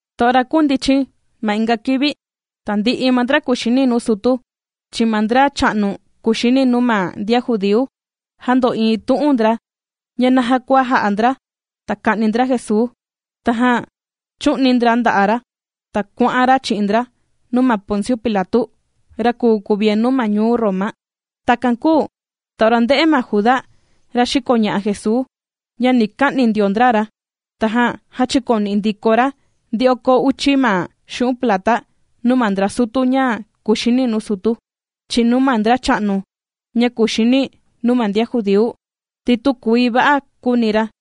Ta ora kūndichin ma inga kivi, tandi'i ma ndra kùxini nuu sutu, chi'in ma ndracha'nu kuxini nuu ma ndian judíu, jāndo'iin tu'un ndra, ña naja kua jà'a ndra, ta ka'ni ndra Jesuu. Tajan chū'ni ndra nda'a' ra, ta kuà'an ra chi'in ndra nuu ma Ponciu Pilatu, ra kùu kuvienu ma ñuu Roma. Takan kūu ta ora ndē'e ma Juda, ra xīkoña'a Jesuu, ña ni ka'ni ndio ndra ra, tajan jāchikoni'i ndiko ra, ndi oko uchi ma xu'un' plata nuu ma ndra sutu ña kuxini nuu sutu, chi'in nuu ma ndracha'nu ña kuxini nuu ma ndian judíu, ti tükuii va'a kūuni ra,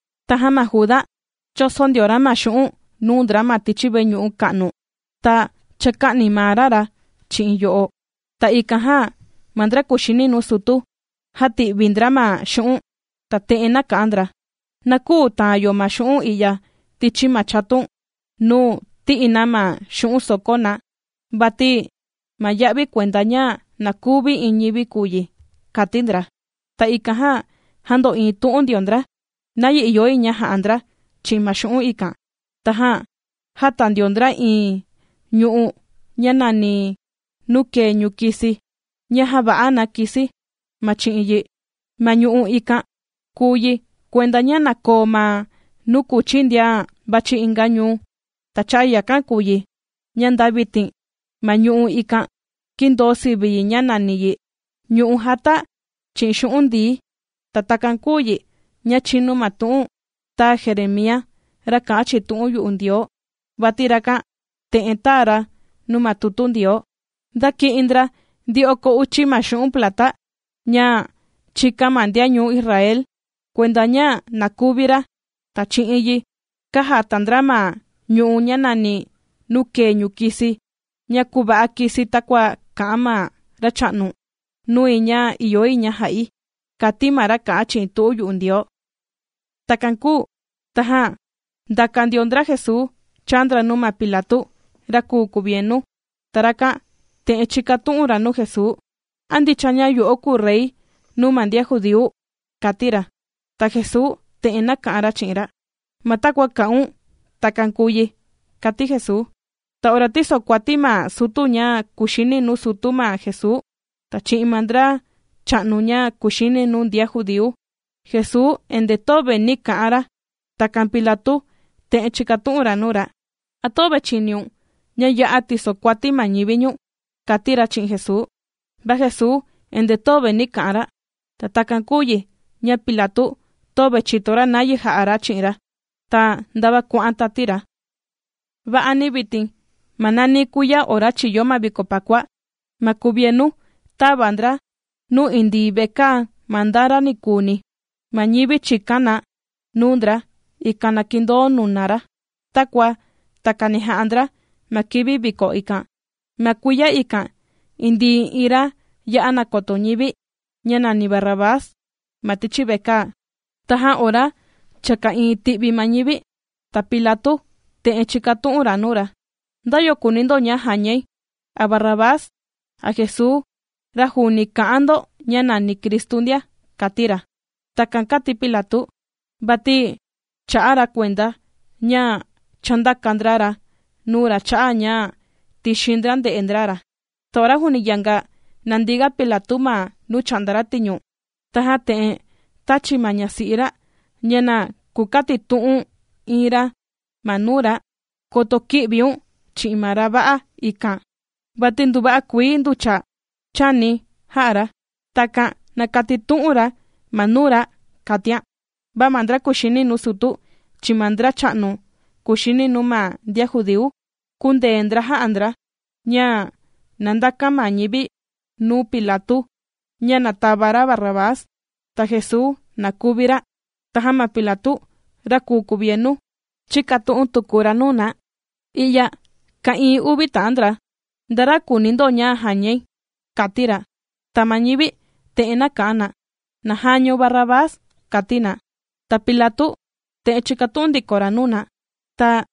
Tajan ma Juda chōso ndio ra ma xu'un' nuu ndra ma tichi veñu'u ka'nu, ta chāka'ni maa ra ra chi'in yo'o. Ta ikan jan ma ndra kùxini nuu sutu, jāti'vi ndra ma xu'un' ta te'en nāka'an ndra: ―Na küu taan yo ma xu'un' i'ya tichi ma chatun nuu tì'i na ma xu'un' sòkó na, vati ma ya'vi kuenda ña na kuvi iin ñivi kùu yi ―kàti ndra. Ta ikan jan jāndo'iin tu'un ndio ndra, nayi ìyo yi ña ja'a ndra chi'in ma xu'un' ikan. Tajan jāta ndio ndra iin ñu'u', ña nàni, nuu kèe ñukisi, ña jàva'a na kisi, ma chi'in yi. Ma ñu'u' ikan kùu yi, kuenda ña na koo ma nuu kuchi ndian vàchi inga ñuu. Ta cha'a yakan kùu yi, ña nda vitin, ma ñu'u' ikan kīndoo sivi yi ña nàni yi: “Ñu'u' jāta chi'in xu'un' ndií.” Ta takan kūu yi ña chīnu ma tu'un tāa Jeremía, ra kā'an chi'in tu'un yu'u Ndioo, vati rakan te'en tāa ra nuu ma tutu Ndioo: “Ndāki'in ndra, ndi oko uchi ma xu'un' plata, ña chīkan ma ndian ñuu Israel, kuenda ña na kuvi ra. Ta chi'in yi, kājata ndra ma ñu'u', ña nàni nuu kèe ñukisi ña kùva'a kisi takua kā'an ma Racha'nu nui ña ìyo yi ña ja'i”, kàti ma ra kà'an chi'in tu'un yu'u Ndioo. Takan kūu tajan ndàka ndio ndra Jesuu chāa ndra nuu ma Pilatu, ra kùu kuvienu, ta rakan te'en chīkatu'un ra nuu Jesuu: ―¿A ndicha ña yo'o kùu Rey nuu ma ndian judíu? ―kàti ra. Ta Jesuu te'en nāka'an ra chi'in ra: ―Ma takua kà'un, takan kùu yi ―kàti Jesuu. Ta ora tìsokuati ma sutu ña kùxini nuu sutu ma Jesuu, ta chi'in ma ndracha'nu ña kuxini nuu ndian judíu, Jesuu endee töve nī ka'an ra. Takan Pilatu te'en chīkatu'un ra nuu ra: ―¿A töve chìniun, ña ya'a tìsokuati ma ñivi ñu̱n? ―kàti ra chi'in Jesuu. Va Jesuu endee töve nī ka'an ra. Ta takan kūu yi, ña Pilatu töve chìto ra nayi jà'a ra chi'in ra, ta ndava kuà'an tati ra. Va'ani vitin, ma nani kuiya ora chìyo ma viko Pakua, ma kuvienu tàva ndra yo indii vekaa ma nda ra ni kuuni ma ñivi chìkan na nuu ndra, ikan na kindoo nuna ra. Takua takani jà'a ndra ma kivi viko ikan. Ma kuiya ikan indii iin ra ya'a nàkoto ñivi, ña nàni Barrabás ma tichi vekaa. Tajan ora cha ka'ìin ti'vi ma ñivi, ta Pilatu te'en chīkatu'un ra nuu na: ―¿Nda yo kùuni ndo ña jañai, a Barrabás, a Jesuu, ra juuni kà'an ndo ña nàni Cristu ndia? ―kàti ra. Takan kàti Pilatu, vati chā'a ra kuenda, ña chāndaka ndra ra nuu ra cha'a' ña tìxin ndra nde'e ndra ra. Ta ora juuni yanga nàndi ga Pilatu ma nuu chà'nda ra tiñu, tajan te'en tāchi ma ñasi'i ra ña na kukatitu'un iin ra ma nuu ra: “Koto kï'viun chi'in ma ra va'a ikan, vati nduva'a kuii nducha chāni̱ jā'a ra.” Takan na katitu'un ra ma nuu ra, kàtian. Va ma ndra kùxini nuu sutu, chi'in ma ndracha'nu kuxini nuu ma ndian judíu, kūndee ndra jā'a ndra, ña na ndakan ma ñivi nuu Pilatu, ña na tava ra Barrabás, ta Jesuu, na kuvi ra. Tajan ma Pilatu ra kùu kuvienu, chīkatu'un tuku ra nuu na: ―I'ya ka'ìin uvi ta'an ndra: ¿nda ra kùuni ndo ña jañai? ―kàti ra. Ta ma ñivi te'en nāka'an na: ―Na jañaun ma Barrabás ―kàti na. Ta Pilatu te'en chīkatu'un ndiko ra nuu na: ―Ta,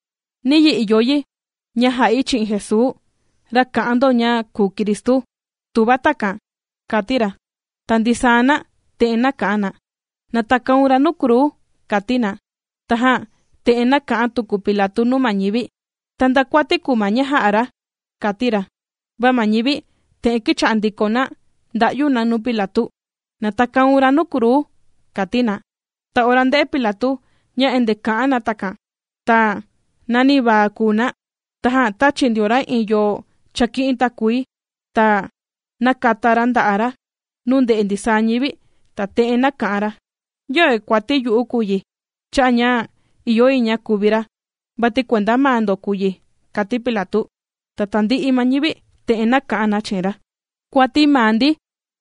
¿niyi ìyo yi ña ja'i chi'in Jesuu, ra kà'an ndo ña kùu Cristu?, tuva takan ―kàti ra. Ta ndisaa na, te'en nāka'an na: ―¡Na takaun ra nuu kruu! ―kàti na. Tajan te'en nāka'an tuku Pilatu nuu ma ñivi: ―Ta, ¿nda kuati kùu ma ña jā'a ra? ―kàti ra. Va ma ñivi te'en kīcha'a ndiko na ndà'yu na nuu Pilatu: ―¡Na takaun ra nuu kruu! ―kàti na. Ta ora ndē'e Pilatu, ña endee kà'an na takan, ta nanivaa kùu na, tajan tāchi ndio ra iin yo chāki'in takuii, ta nākata ra nda'a' ra nuu ndè'e ndisaa ñivi, ta te'en nāka'an ra: ―Yöve kuati yu'u kùu yi, cha'a' ña ìyo yi ña kuvi ra, vati kuenda maa ndo kùu yi ―kàti Pilatu. Ta tandi'i ma ñivi, te'en nāka'an na chi'in ra: ―¡Kuati maa ndi,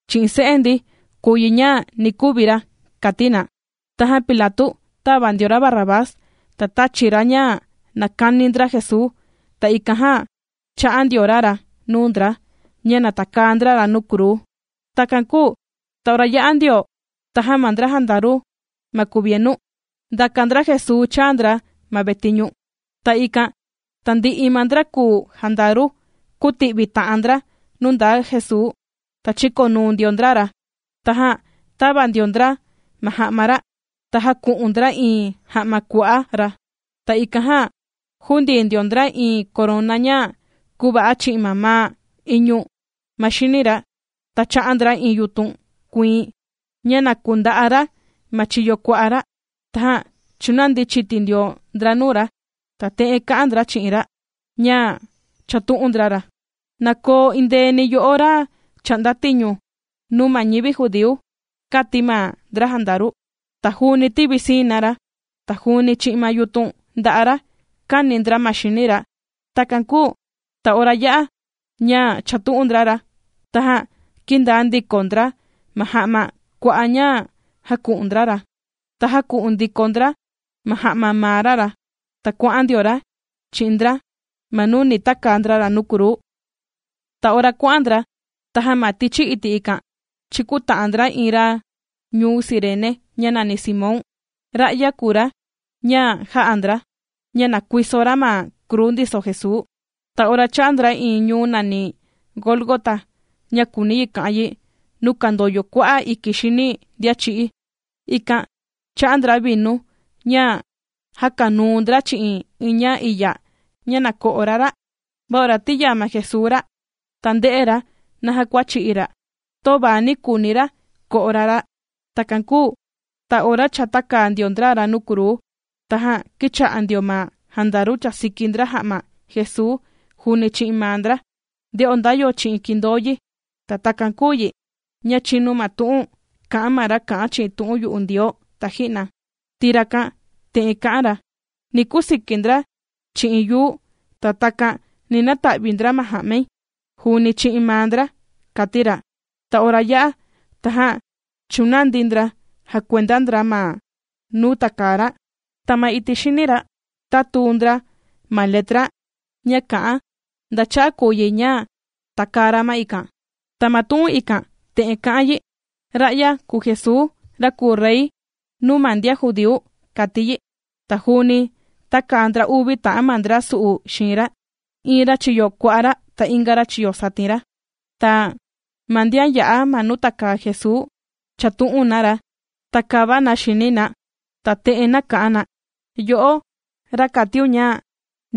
chi'in se'e ndi, kùu yi ña ni kuvi ra! ―kàti na. Tajan Pilatu tāva ndio ra Barrabás, ta tāchi ra ña na kani ndra Jesuu, ta ikan jan chā'a ndio ra ra nuu ndra, ña na takaa ndra ra nuu kruu. Takan kūu ta ora yā'a ndio, tajan ma ndra jandaru ma kuvienu, ndàka ndra Jesuu chāa ndra ma vetiñu. Ta ikan tandi'i ma ndra kùu jandaru, kūti'vi ta'an ndra nuu ndaa Jesuu, ta chīkonuu ndio ndra ra. Tajan tāva ndio ndra ma ja'ma ra, ta jāku'un ndra iin ja'ma kua'á ra. Ta ikan jan jūndii ndio ndra iin korona ña kūva'a chi'in mamaa iñu ma xini ra, ta chā'a ndra iin yutun kuiin, ña na kunda'a ra ma chiyo kua'a ra. Tajan chūnandi chiti ndio ndra nuu ra, ta te'en kà'an ndra chi'in ra, ña chàtu'un ndra ra: ―¡Na koo endeeni yo'o ra chà'nda tiñu nuu ma ñivi judíu! ―kàti ma ndra jandaru. Ta juuni tīvisii na ra, ta juuni chi'in ma yutun nda'a ra kāni ndra ma xini ra. Takan kūu ta ora yā'a ña chàtu'un ndra ra, tajan kīndaa ndiko ndra ma ja'ma kua'á ña jāku'un ndra ra, ta jāku'un ndiko ndra ma ja'ma maa ra ra, ta kuà'an ndio ra chi'in ndra ma nuu ni takaa ndra ra nuu kruu. Ta ora kuà'an ndra, tajan ma tichi iti' ikan, chīkuta'an ndra iin ra ñuu Cirene, ña nàni Simón. Ra'ya kùu ra, ña jā'a ndra ña na kuiso ra ma kruu ndiso Jesuu. Ta ora chāa ndra iin ñuu nàni Gólgota, ña kùuni yi kà'an yi, nuu kàndoyo kua'a' iki xini ndian chī'í. Ikan chā'a ndra vinu ña jākanuu ndra chi'in iin ña iya ña na ko'o ra ra'. Va ora tīyaa ma Jesuu ra ra', ta ndē'e ra naja kua chì'i ra', töva ni kuuni ra ko'o ra ra'. Takan kūu ta ora cha tākaa ndio ndra ra nuu kruu, tajan kīcha'a ndio ma jandaru chàsiki ndra ja'ma Jesuu juuni chi'in maa ndra, nde'o nda yo chi'in kindoo yi. Ta takan kūu yi, ña chīnu ma tu'un kā'an ma ra kā'an chi'in tu'un yu'u Ndioo taji'na, ti rakan te'en kā'an ra: “Ni kusiki ndra chi'in yuu, ta takan ni nata'vi ndra ma ja'mai juuni chi'in maa ndra”, kāti ra. Ta ora yā'a, tajan chūnandi ndra jàkuenda ndra ma nuu tàkaa ra. Ta ma iti' xini ra, tātuu ndra ma letra, ña kà'an nda cha'a' kùu yi ña tākaa ra ma ikan. Ta ma tu'un ikan, te'en kà'an yi: “Ra'ya kùu Jesuu, ra kùu Rey nuu ma ndian judíu”, kàti yi. Ta juuni tākaa ndra uvi ta'an ma ndra su'u xiin ra, iin ra chiyo kua'a ra, ta inga ra chiyo satin ra. Ta ma ndian yā'a ma nuu tàkaa Jesuu, chàtu'un na ra, ta kàva na xini na, ta te'en kà'an na: ―Yo'o, ra kàtiun ña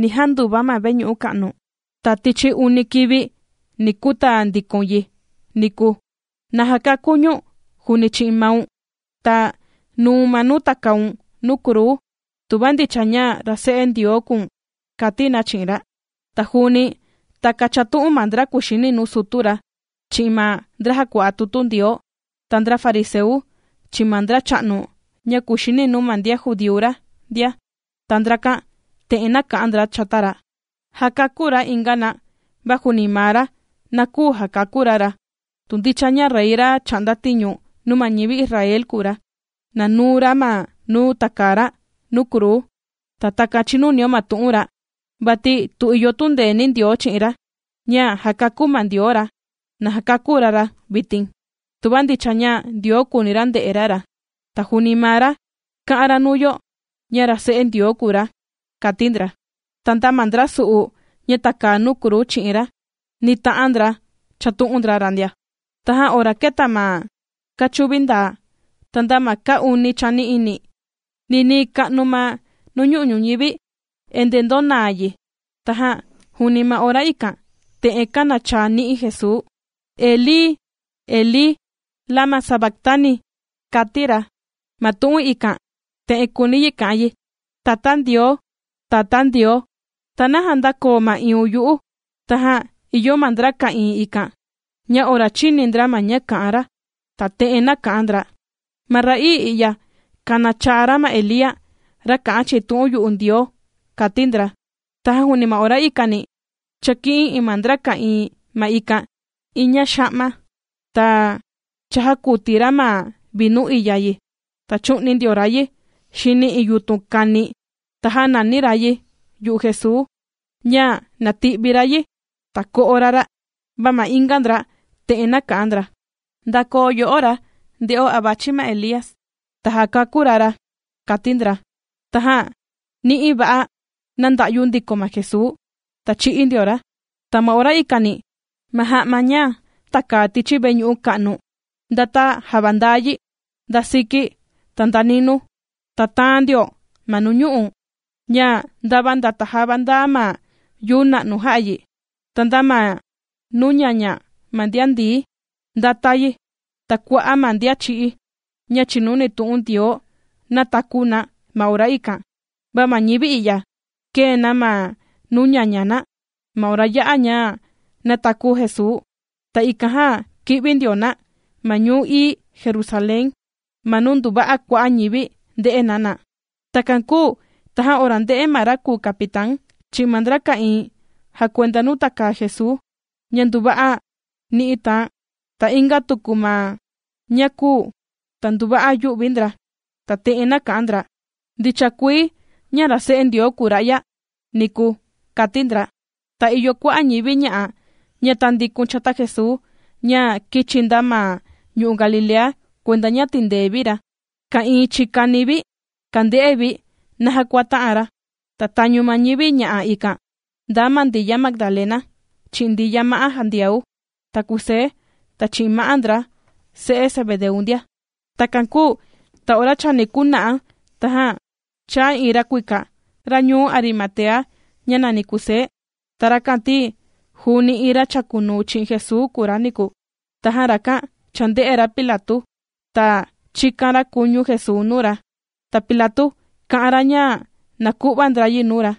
ni janduva ma veñu'u ka'nu, ta tichi uni kivi, ni kutaa ndikoun yi niku, na jakakun ñu̱n, juuni chi'in maun, ta nuu̱n ma nuu takaun nuu kruu, tuva ndicha ña ra Se'e Ndioo kùu̱n ―kàti na chi'in ra. Ta juuni takan chàtu'un ma ndra kuxini nuu sutu ra, chi'in ma ndra jàkua'a tutu Ndioo, ta ndra fariseu, chi'in ma ndracha'nu ña kuxini nuu ma ndian judíu ra ndia. Ta ndrakan te'en kā'an ndra chata ra: ―Jākakú ra inga na, va juuni maa ra, na küu jakakú ra ra. Tu ndicha ña Rey ra chà'nda tiñu nuu ma ñivi Israel kùu ra, na nuu ra ma nuu takaa ra nuu kruu, ta takan chinunio ma tu'un ra. Vati tu ìyo tundeeni Ndioo chi'in ra, ña jakakú ma Ndioo ra, na jakakú ra ra vitin, tuva ndicha ña Ndioo kùuni ra nde'e ra ra. Ti juuni maa ra kā'an ra nuu yo, ña ra Se'e Ndioo kùu ra ―kàti ndra. Ta nda ma ndra su'u, ña tàkaa nuu kruu chi'in ra, ndita'an ndra chàtu'un ndra ra ndia. Tajan ora kēta ma kachuvi ndaa, ta nda ma kaa uni chani'ini, ninii ka'nu ma nuñu'u' ñuñivi, endee ndōnaa yi. Tajan juuni ma ora ikan, te'en kānachaa ni'i Jesuu: ―Elí, Elí ¿lama sabactani? ―ma tu'un ikan, te'en kùuni yi ka'an yi: Tatá Ndioo, Tatá Ndioo, ¿ta naja ndākoo ma'iiun yu'u? ―kàti ra. Tajan ìyo ma ndra ka'ìin ikan, ña ora chīni ndra ma ña kā'an ra, ta te'en nāka'an ndra: ―Ma ra'ii i'ya kànachaa ra ma Elía, ra kā'an chi'in tu'un yu'u Ndioo ―kàti ndra. Tajan juuni ma ora ikani, chāki'in iin ma ndra ka'ìin ma ikan, iin ña xa'ma, ta cha jākuti ra ma vinu iya yi, ta chū'ni ndio ra yi xini iin yutun kani, ta jānani ra yi yu'u Jesuu, ña na ti'vi ra yi, ta ko'o ra ra'. Va ma inga ndra te'en nāka'an ndra: ―Ndakoo yo'o ra, nde'o a vàchi ma Elía, ta jàkakú ra ra ―kàti ndra. Tajan ni'i va'a nānda'yu ndiko ma Jesuu, ta chī'í ndio ra. Ta ma ora ikani, ma ja'ma ña tàkaa tichi veñu'u ka'nu, ndāta javandaa yi, nda siki, ta nda ninuu. Ta tāan ndio ma nuñu'u', ña ndava ndāta java ndaa ma yuu na'nu jā'a yi. Ta nda ma nuu ñaña ma ndian ndií, ndāta yi, ta kua'a' ma ndian chī'í, ña chìnuni tu'un Ndioo, nātaku na ma ora ikan. Va ma ñivi i'ya, kēe na ma nuu ñaña na, ma ora yā'a ña nātaku Jesuu, ta ikan jan kī'vi ndio na ma ñuu ií Jerusalén, ma nuu nduva'a kua'a' ñivi ndē'e na na. Takan kūu tajan ora ndē'e ma ra kùu capitán, chi'in ma ndra ka'ìin jàkuenda nuu tàkaa Jesuu, ña nduva'a ni'i tāan, ta inga tuku ma ña kūu, ta nduva'a yū'vi ndra, ta te'en nāka'an ndra: ―¡Ndicha kuii, ña ra Se'e Ndioo kūu ra'ya niku! ―kāti ndra. Ta ìyo kua'a' ñivi ña'a, ña tāndikun chata Jesuu, ña kīchi nda ma ñu'u' Galilea kuenda ña tìndee vi ra, ka'ìin chikani vi kànde'e vi, naja kua tā'an ra. Ta tañu ma ñivi ña'a ikan, ndaa ma Ndiya Magdalena, chi'in Ndiya ma'á Jandiau, ta Kusé, ta chi'in ma'á ma ndra se'e Zebedeu ndia. Takan kūu, ta ora chani kuna'a, tajan chāa iin ra kuika, ra ñuu Arimatea, ña nàni Kusé. Ta rakan ti, juuni iin ra chākunuu chi'in Jesuu kùu ra niku. Tajan rakan chānde'e ra Pilatu, ta chīkan ra kuñu Jesuu nuu ra. Ta Pilatu kà'an ra ña na ku'va ndra yi nuu ra.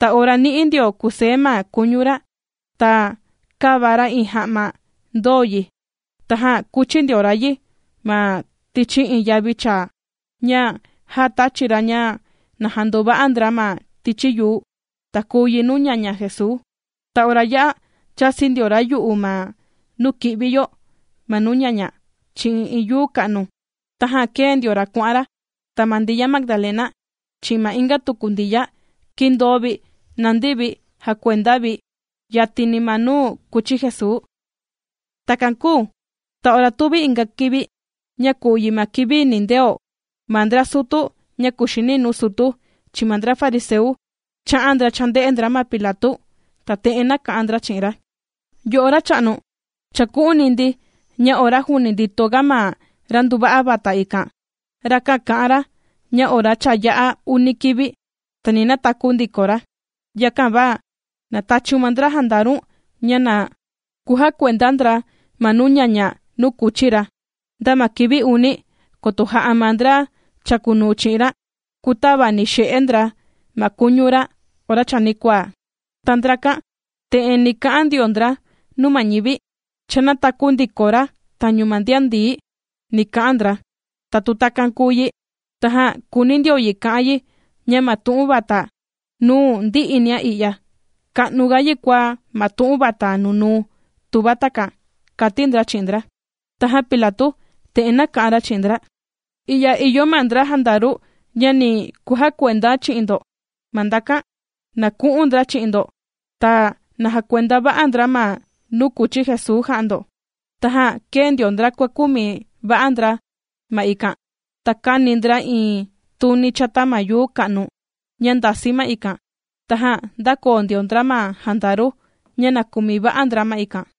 Ta ora nī'i ndio Kusé ma kuñu ra, ta kāva ra iin ja'ma ndōo yi. Tajan kūchi ndio ra yi ma tichi iin yavi chaa, ña ja tāchi ra ña na jandova'a ndra ma tichi yuu, ta kùu yi nuu ñaña Jesuu. Ta ora yā'a chāsi ndio ra yu'u ma nuu kì'vi yo ma nuu ñaña, chi'in iin yuu ka'nu, tajan kēe ndio ra kuà'an ra. Ta ma Ndiya Magdalena, chi'in ma inga tuku Ndiya, kīndoo vi nàndi vi jàkuenda vi, yatini ma nuu kūchi Jesuu. Takan kūu ta ora tuvi inga kivi, ña kùu yi ma kivi nindeo, ma ndra sutu, ña kuxini nuu sutu, chi'in ma ndra fariseu, chā'an ndra chānde'e ndra ma Pilatu, ta te'en nāka'an ndra chi'in ra: ―Yo'o racha'nu, chāku'uni ndi, ña ora juuni ndito ga ma ra nduva'a vata ikan, rakan kā'an ra, ña ora cha yā'a uni kivi, ta ni nataku ndiko ra. Yakan va na tachiun ma ndra jandaru̱n, ña na kujakuenda ndra ma nuu ñaña nuu kūchi ra, nda ma kivi uni, koto ja'a ma ndra chàkunuu chi'in ra, kūtavani'i xe'e ndra ma kuñu ra ora chanikuaa, ta ndrakan, te'en ni ka'an ndio ndra nuu ma ñivi: “Cha nātaku ndiko ra tañu na ndian ndií”, ni ka'an ndra. Ta tu takan kùu yi, tajan kùuni ndio yi ka'an yi, ña ma tu'un vata nuu ndi'inia i'ya, ka'nuga yi kua ma tu'un vata nunuu, tuva takan ―kàti ndra chi'in ndra. Tajan Pilatu te'en nāka'an ra chi'in ndra: ―I'ya ìyo ma ndra jandaru ña ni kujakuenda chi'in ndo ma ndakan. Na ku'un ndra chi'in ndo, ta na jakuenda va'a ndra ma nuu kūchi Jesuu jà'a ndo. Tajan kēe ndio ndra kuàkumi va'a ndra ma ikan. Ta kāni ndra iin tuni chata ma yuu ka'nu ña ndàsi ma ikan. Tajan ndākoo ndio ndra ma jandaru, ña na kumi va'a ndra ma ikan.